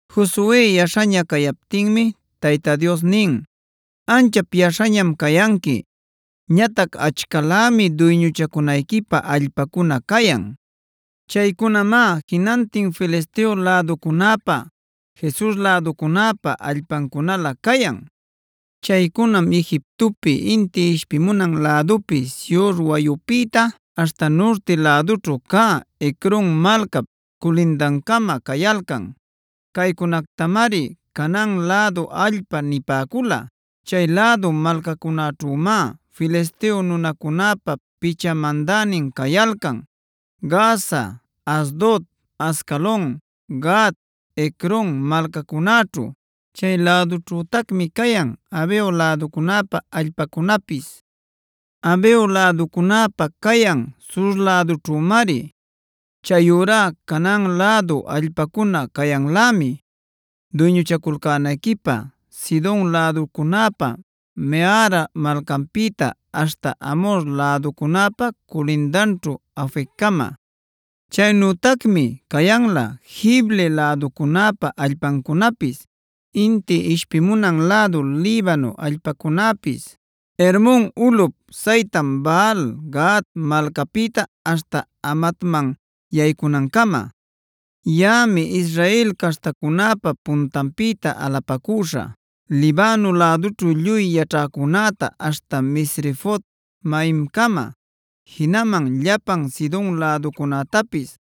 Josue yaśhaña cayaptinmi Tayta Dios nin: “Anchap yaśhañam cayanqui. Ñatac achcalämi duyñuchacunayquipä allpacuna cayan. Chaycunamá jinantin Filisteo läducunäpa, Gesur läducunäpa allpancunalä cayan. Chaycunam Egiptopi inti ishpimunan lädupi Sihor wayupïta aśhta nurti lädućhu cä Ecron malcap culindancama cayalcan. Caycunactamari Canaan lädu allpa nipäcula; chay lädu malcacunäćhümá Filisteo nunacunäpa picha mandänin cayalcan: Gaza, Asdod, Ascalon, Gat, Ecron malcacunäćhu. Chay lädućhütacmi cayan Aveo läducunäpa allpacunapis. Aveo läducunäpa cayan sur lädućhümari. Chayurá Canaan lädu allpacuna cayanlämi duyñuchaculcänayquipä Sidon läducunäpa Mehara malcanpïta aśhta Amhor läducunäpa culindanćhu Afeccama. Chaynütacmi cayanlä Gibli läducunäpa allpancunapis, inti ishpimunan lädu Libano allpacunäpis, Hermon ulꞌup saytan Baal-gaad malcapïta aśhta Hamatman yaycunancama. Yaꞌami Israel caśhtacunäpa puntanpïta alupacüśha Libano lädućhu lluy yaćhäcunäta aśhta Misrefot-maimcama,a jinaman llapan Sidon läducunätapis.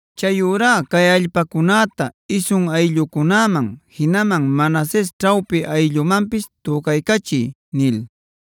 Chayurá cay allpacunäta isun ayllucunäman, jinaman Manases ćhawpi ayllumanpis tücaycachiy” nil.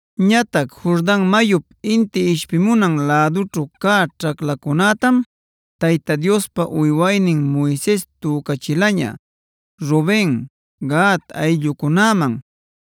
Ñatac Jordan mayup inti ishpimunan lädućhu cä ćhaclacunätam Tayta Diospa uywaynin Moises tücachilaña Ruben, Gad ayllucunäman,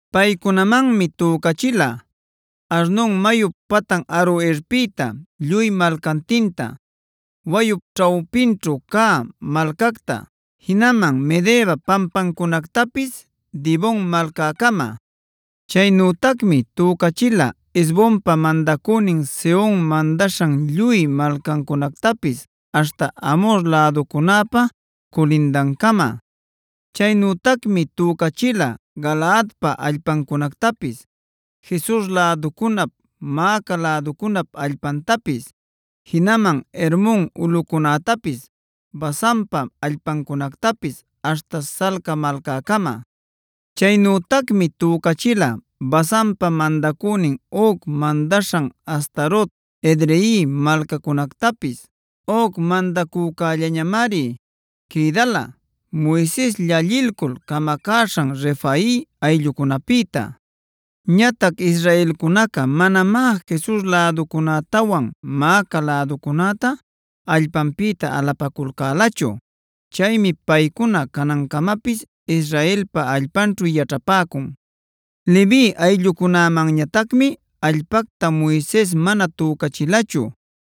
Paycunamanmi tücachila: Arnon mayup patan Aroerpïta lluy malcantinta, wayup ćhawpinćhu cä malcacta; jinaman Medeba pampancunactapis Dibon malcäcama. Chaynütacmi tücachila Hesbonpa mandacünin Sehon mandaśhan lluy malcancunactapis aśhta Amhor läducunäpa culindancama. Chaynütacmi tücachila Galaadpa allpancunactapis, Gesur läducunap, Maaca läducunap allpantapis, jinaman Hermon ulꞌucunätapis, Basanpa allpancunactapis aśhta Salca malcäcama. Chaynütacmi tücachila Basanpa mandacünin Og mandaśhan Astarot, Edrei malcacunactapis. Og mandacücällañamari quïdala Moises llallilcul camacäśhan Refai ayllucunapïta. Ñatac israelcunaca manamá Gesur läducunätawan Maaca läducunäta allpanpïta alapaculcälachu. Chaymi paycuna canancamapis Israelpa allpanćhu yaćhapäcun. Levi ayllucunämanñatacmi allpacta Moises mana tücachilachu.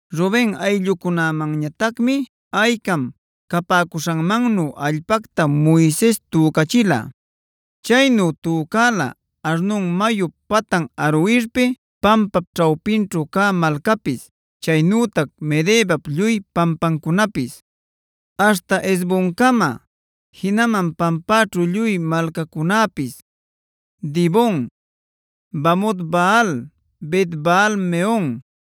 Ruben ayllumanñatacmi aycam capäcuśhanmannu allpacta Moises tücachila. Chaynu tücala Arnon mayup patan Aroerpi, pampap ćhawpinćhu cä malcapis, chaynütac Medebap lluy pampancunapis, aśhta Hesboncama, jinaman pampäćhu lluy malcacunäpis: Dibon, Bamot-baal, Bet-baal-meon,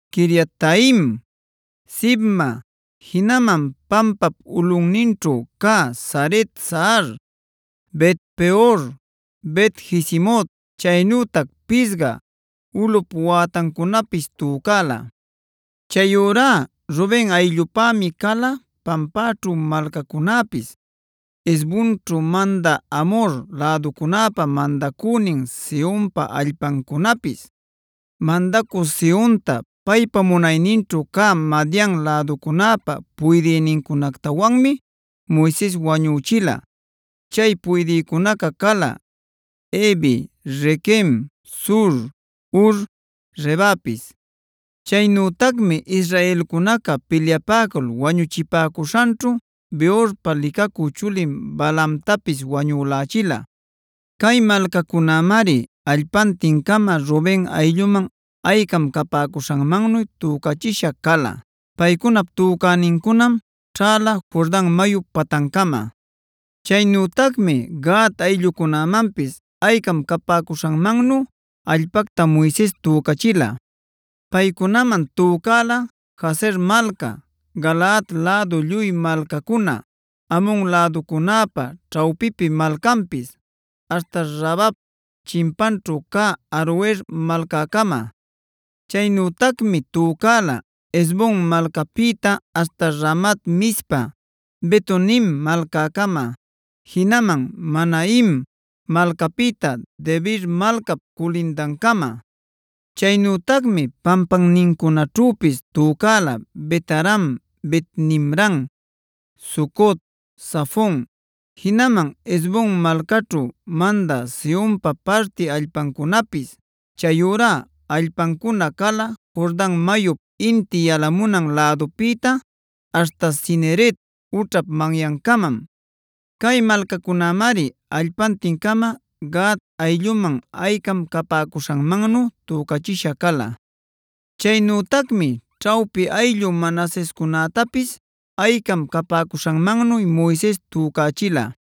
Quiriataim, Sibma, jinaman pampap ulꞌunninćhu cä Zaret-sahar, Bet-peor, Bet-jesimot, chaynütac Pisga ulꞌup wätancunapis tücala. Chayurá Ruben ayllupämi cala pampaćhu malcacunäpis, Hesbonćhu mandä Amhor läducunäpa mandacünin Sehonpa allpancunapis. Mandacü Sehonta paypa munayninćhu cä Madian läducunäpa puydïnincunactawanmi Moises wañüchila. Chay puydïcunaca cala: Evi, Requem, Zur, Hur, Rebapis. Chaynütacmi israelcunaca pilyapäcul wañuchipäcuśhanćhu Beorpa licacü chulin Balaamtapis wañülächila. Cay malcacunämari allpantin-cama Ruben aylluman aycam capäcuśhanmannu tücachisha cala. Paycunap tücänincunam ćhäla Jordan mayup patancama. Chaynütacmi Gad ayllucunämanpis aycam capäcuśhanmannu allpacta Moises tücachila. Paycunaman tücala: Jazer malca, Galaad lädu lluy malcacuna, Amon läducunäpa ćhawpipi malcanpis, aśhta Rabap chimpanćhu cä Aroer malcäcama. Chaynütacmi tücala Hesbon malcapïta aśhta Ramat-mizpa, Betonim malcäcama, jinaman Mahanaim malcapïta Debir malcap culindancama. Chaynütacmi pampannincunaćhüpis tücala Bet-aram, Bet-nimran, Sucot, Zafon, jinaman Hesbon malcaćhu mandä Sehonpa parti allpancunapis. Chayurá allpancuna cala Jordan mayup inti yalamunan lädupïta aśhta Cineret ućhap manyancamam. Cay malcacunämari allpantin-cama Gad aylluman aycam capäcuśhanmannu tücachisha cala. Chaynütacmi ćhawpi ayllu Manasescunätapis aycam capäcuśhanmannu Moises tücachila.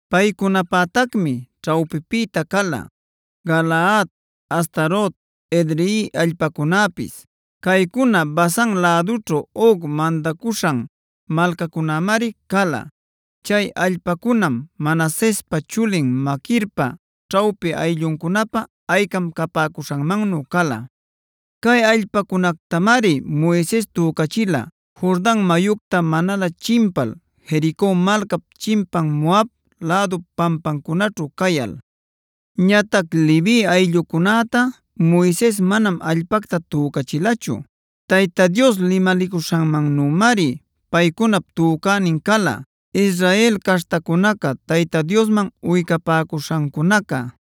Paycunapätacmi ćhawpipïta cala: Galaad, Astarot, Edrei allpacunäpis. Caycuna Basan lädućhu Og mandacuśhan malcacunamari cala. Chay allpacunam Manasespa chulin Maquirpa ćhawpi aylluncunapä aycam capäcuśhanmannu cala. Cay allpacunactamari Moises tücachila Jordan mayucta manalä chimpal Jerico malcap chimpan Moab lädup pampancunaćhu cayal. Ñatac Levi ayllucunätá Moises manam allpacta tücachilachu. Tayta Dios limalicuśhanmannümari paycunap tücänin cala Israel caśhtacunaca Tayta Diosman uycapäcuśhancunaca.e